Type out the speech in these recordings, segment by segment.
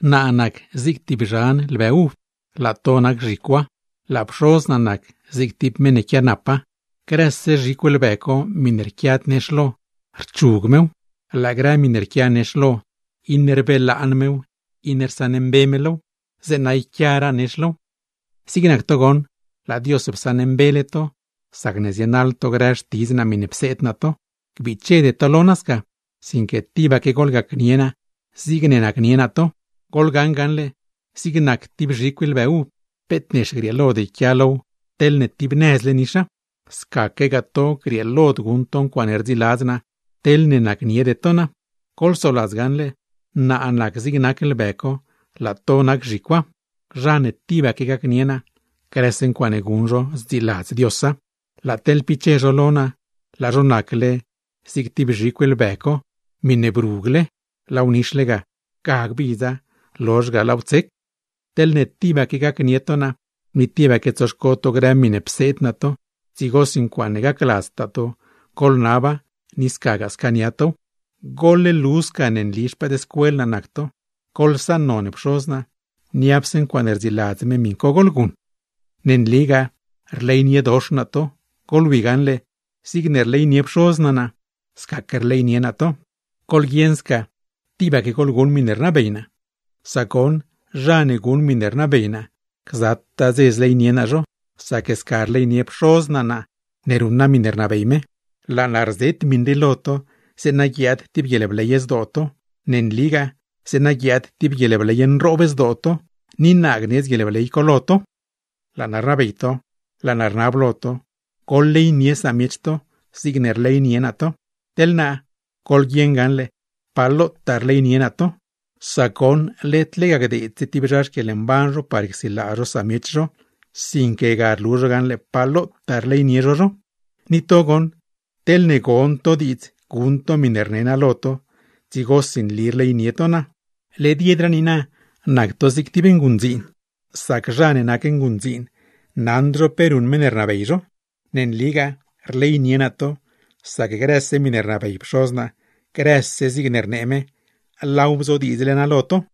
’Naa nac zig tib zhan lbë uv, laa to nac zhicwa, laa Pxoz naa nac zig tib zha ne quianapa. Grëse zhicw lbë co miṉe rquiad nex lo, rchug mew; laa grë miṉe rquia nex lo, iṉe rsaṉmbe me low, rbelaan me low zeeṉa yquiaraa nex low. ’Zig nac to goṉ, laa Dios psaṉmbele to sacne zienaḻ to grë xtidz naa miṉe pseed naa to. Gbichede to lo naa sca, sinque tibaque goḻgacnie naa zigne nacnie naa to. Goḻgaṉ gaṉle, zig nac tib zhicw lbë uv, peet nex grieelod yquia low teḻne tibnëzle nixa; scaquegaa to nagoṉ, grieelod guṉ to grë ncuaaṉe rdziladz naa, teḻne nacniede to naa. Goḻsoladz gaṉle: Naa nac zig nac lbë co, laa to nac zhicwa. Zha ne tibaque gacnie naa, grëse ncuaaṉe guṉ zho zdziladz Diosa; sac teḻ piche zho lo naa, laa zho nacle zig tib zhicw lbë co miṉe nixle tib nëz, laaw nixle ga, ga gbidza; lozh ga laaw tsec. Teḻne tibaque gacnie to naa, ni tibaque tsoxco to grë miṉe pseed naa to, dzigosi ncuaaṉe gacladztaa to goḻnaba, ni scagaa scaania tow. ’Goḻlu sca ne nli xpëëdscuel naa nac to, goḻsaṉnon Pxoz naa, niapse ncuaaṉe rdziladz me miṉ co goḻguṉ. ’Ne nligaa rleyniedox naa to. Goḻwi gaṉle, zigne rleynie Pxoz naa naa, scaque rleynie naa to. Goḻguieṉ sca tibaque goḻguṉ miṉe rnabey naa. Sac goṉ, zha ne guṉ miṉe rnabey naa, gzataa dze zleynie naa zho; sac sca rleynie Pxoz naa naa ne ruṉ naa miṉe rnabey me. Laa naa rzet miṉ rii lo to, zeeṉa guiaad tib guieḻbley zdoo to. Ne nligaa, zeeṉa guiaad tib guieḻbley nroob zdoo to; ni naa gnedz guieḻbley co lo to. ’Laa naa rnabey to, laa naa rnab lo to: ¡Goḻleynie samiech to, zigne rleynie naa to! Teḻ naa, goḻguieṉ gaṉle pa lotaa rleynie naa to, sac led lega gdeedse tib zha xquieḻmban zho par csilaa zho samiech zho, sinque ga rlu zho gaṉle pa lotaa rleynie zho zho. ’Ni to goṉ, teḻne gon to grë miṉe rne naa lo to, dzigosi nli rleynie to naa. Led yedraa niina nac to zig tib nguṉdziin, sac zha ne nac nguṉdziin naṉd zho pe ruṉ meṉ ne rnabey zho. Ne nligaa rleynie naa to, sac grëse miṉe rnabey Pxoz naa, grëse zigne rnee me, laaw bzodiidzle naa lo to.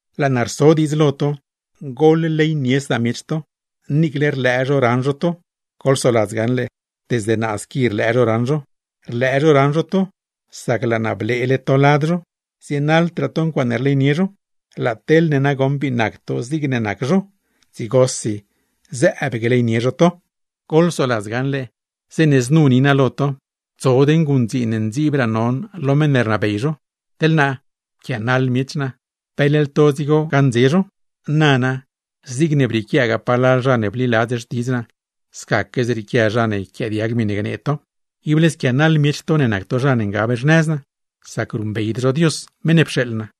Laa naa rso diidz lo to: Goḻleynie samiech to. Niicle rlëë zho raṉ zho to, goḻsoladz gaṉle, desde naa squi rlëë zho raṉ zho. Rlëë zho raṉ zho to, sac laa naa bleele to lad zho, zienaḻdraa to ncuaaṉe rleynie zho; laa teḻne nagoṉ bii nac to zigne nac zho, dzigosi zëëb gleynie zho to. Goḻsoladz gaṉle, zeeṉe znu ni naa lo to: ¡Tsod nguṉdziin ne ndziibsraa non lo zha ne rnabey zho! Teḻ naa, pquianaḻ miech naa, ¿pe leḻ to dzigo gaṉdze zho? Nana, zigne brieequiagaa palal zha ne bliladz xtidz naa, scaque zrieequia zha ne yquiaadiag miṉe gnee to. ’Ible squianaḻ miech to ne nac to zha ne ngab xnëz naa, sac ruṉbeyd zho Dios meṉ ne pxeeḻ naa.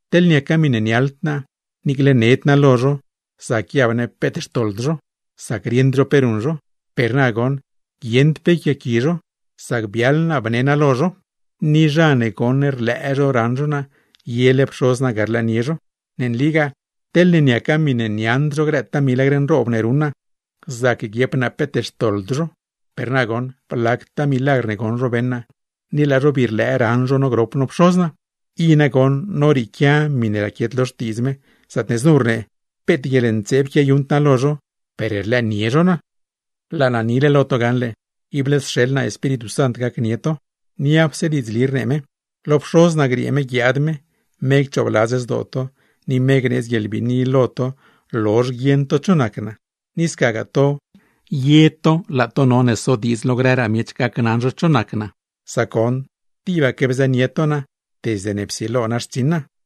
Teḻ niaca miṉe niaḻd naa, niicle ned naa lo zho, zac guiab ne peet xtoḻd zho, sac rieṉd zho pe ruṉ zho. Per na goṉ, guieṉd pe yquiaaqui zho; sac biaḻ naa bne naa lo zho. Zha ne rlëë raṉ zho naa, yele Pxoz naa ga rlëënie zho. Ne nligaa teḻne niaca miṉe niaṉd zho grëtaa milagr nroob ne ruṉ naa, zac guiep naa peet xtoḻd zho; per na goṉ, blactaa milagr ne goṉ zho beṉ naa, ni laa zho bii rlëë raṉ zho no grop no Pxoz naa. I nagoṉ norieequia miṉe raquiet lo Xtiidz Dios, zaatne znu rnee: “Peet guieḻntseeb quiayuṉd naa lo zho, per rlëënie zho naa.” ’Laa naa nile lo to gaṉle, ible sxeḻ naa Espíritu Sant gacnie to, niapse diidzli rnee me. Lo Pxoz naa griee me guiaad me, me cchoobladz zdoo to, ni me gneedz guieḻbiini lo to lozh guieṉ to cho nac naa. Ni scagaa to, ye to laa to none sodiidz lo grëraa miech gacnaṉ zho cho nac naa; sac goṉ tibaque bzënie to naa desde ne psilo naa xtsiṉ naa.